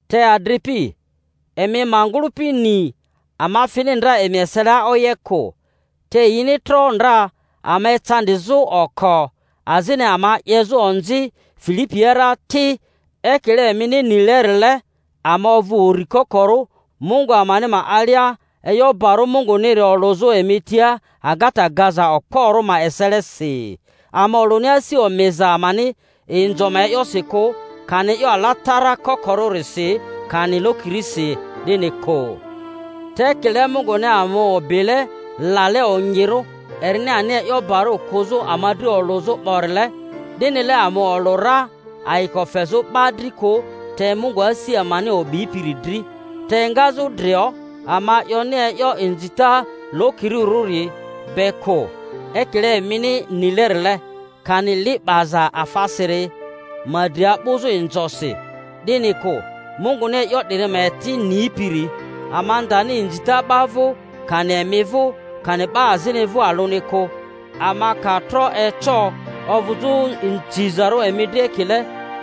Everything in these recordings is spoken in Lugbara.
Te adripi, emi ma ngᴜlᴜpi ni ama fini ndra emi eselia oye kᴜ; te yini tro ndra ama ecandizᴜ oko, azini ama 'yezᴜ onzi Filipia rari ti, ekile emini nilerile, ama ovᴜ uri kokorᴜ Mungu amani ma alia e'yo barᴜ Munguniri olᴜzᴜ emi tia agata gaza okporᴜ ma eselesi. Ama olᴜni asi omiza amani inzo ma e'yosi kᴜ, kani e'yo alatara kokorᴜrisi, kani lokirisi, 'dini kᴜ; te ekile Munguni ama o'bile lale onyirᴜ erini ani e'yo bari kᴜzᴜ ama dri olᴜzᴜ 'borile, 'dinile ama olᴜ ra, ayiko fezᴜ 'ba dri kᴜ, te Mungu asi amani o'bipiri dri. Te engazᴜ drio ama 'yoni e'yo inzita lokirirᴜri be kᴜ, ekile emini nilerile, kani li 'baza afasiri ma dri a'bᴜzᴜ inzosi, 'dini kᴜ, Munguni e'yo 'diri ma eti nipiri; ama ndani inzita 'ba vᴜ, kani emi vᴜ, kani 'ba azini vᴜ alᴜni kᴜ, ama ka tro eco ovᴜzᴜ nzizarᴜ emi dri ekile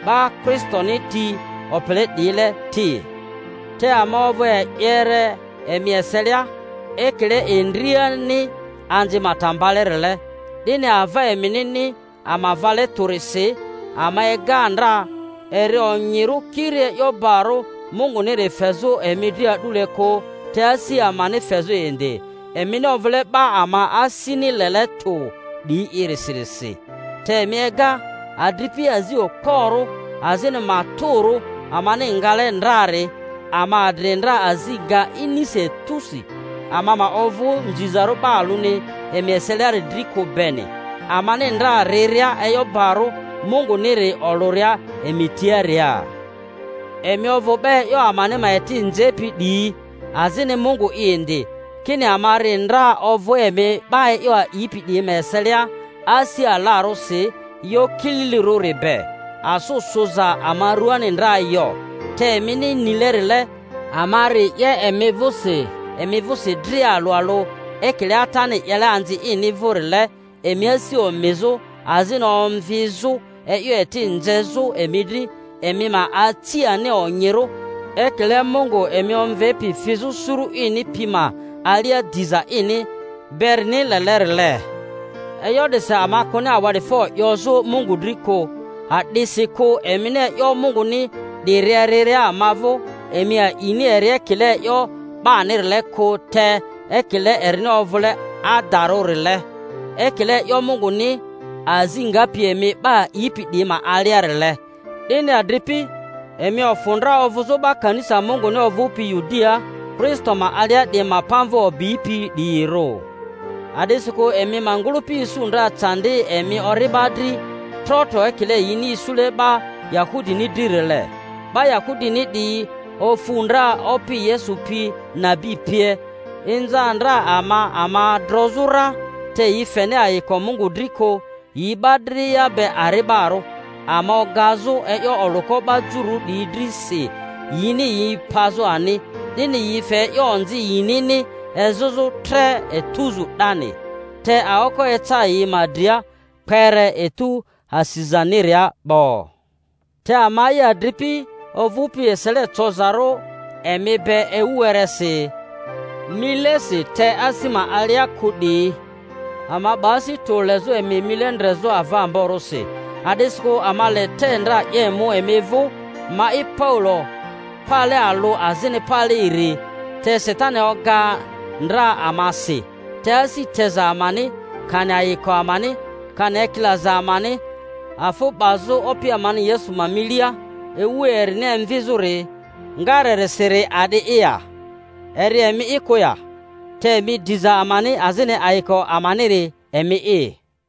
'ba Kristoni ti opele 'diyile ti. Te ama ovᴜ e'yere emi eselia, ekile endriani anzi ma ta mbalerile. 'Dini, ava eminini ama vale tᴜrisi, ama ega ndra eri onyirᴜ kiri e'yo barᴜ Munguniri fezᴜ emi dri a'dule kᴜ, te asi amani fezᴜ indi, emini ovᴜle 'ba ama asini lele tᴜ 'diyi'irisi. Te emi ega, adripi, azi okporᴜ azini matᴜrᴜ amani ngale ndrari; ama adri ndra azi nga inisi etusi, ama ma ovᴜ nzizarᴜ 'ba alᴜni emi eseliari dri kᴜ beni, amani ndra riria e'yo barᴜ Munguniri olᴜria emi tiaria. Emi ovᴜ 'ba e'yo amani ma eti nzepi 'diyi, azini Mungu'i indi, kini ama ri ndra ovᴜ emi 'ba e'yo a'ipi 'diyi ma eselia asi alarᴜsi e'yo kililirᴜri be, asᴜ sᴜza ama ruaani ndra yo; te emini nilerile, ama ri 'ye emi vᴜsi emi vᴜsi dria alᴜ alᴜ, ekile atani 'yele anzi ini vᴜrile, emi asi omizᴜ azini omvizᴜ, e'yo eti nzezᴜ emi dri, emi ma aci ani onyirᴜ ekile Mungu emi omvepi fizᴜ suru ini pi ma alia diza ini berini lelerile. E'yo 'disi ama kᴜni awa'difo 'yozᴜ Mungu dri kᴜ, a'disikᴜ emini e'yo Munguni 'diri eriria ama vᴜ, emi a'ini eri ekile e'yo 'banirile kᴜ, te ekile erini ovᴜle adadarᴜrile, ekile e'yo Munguni, azi ngapi emi 'ba a'ipi 'diyi ma aliarile. 'Dini, adripi, emi ofᴜ ndra ovᴜzᴜ 'ba kanisa Munguni ovᴜpi Yudiaa Kristo ma alia 'diyi ma pamvᴜ o'bipi 'diyirᴜ; a'disikᴜ emi ma ngᴜlᴜpi isu ndra candi emi ori'ba dri trotro ekile yini isule 'ba Yahudini dririle. 'Ba Yahudini 'diyi ofu ndra Opi Yesu pi nabi pie, inza ndra ama ama drozᴜ ra, te yi feni ayiko Mungu dri kᴜ, yi 'ba dria be ari'barᴜ, ama ogazᴜ e'yo olᴜko 'ba Jururᴜ 'diyi dri si yini yi pazᴜ ani—'dini yi fe e'yo onzi yinini ezᴜzᴜ tre etuzu 'dani. Te aoko eca yi ma dria kpere etu asizani-ria 'bo! Te ama'i, adripi, ovᴜpi esele cozarᴜ emi be ewu weresi, milesi te asi ma alia kᴜ 'diyi, ama 'ba asi tᴜ lezᴜ emi mile ndrezᴜ ava amborᴜsi; a'disikᴜ ama le te ndra 'ye mu emi vᴜ—ma'i Paulo pale alᴜ azini pale iri—te Satani oga ndra ama si. Te asi teza amani.. kani ayiko amani, kani ekilaza amani afᴜ 'bazᴜ Opi amani Yesu ma milia, ewu erini emvizᴜri ngarerisiri a'di'i ya? Eri emi'i kᴜ ya? Te emi diza amani azini ayiko amaniri emi'i.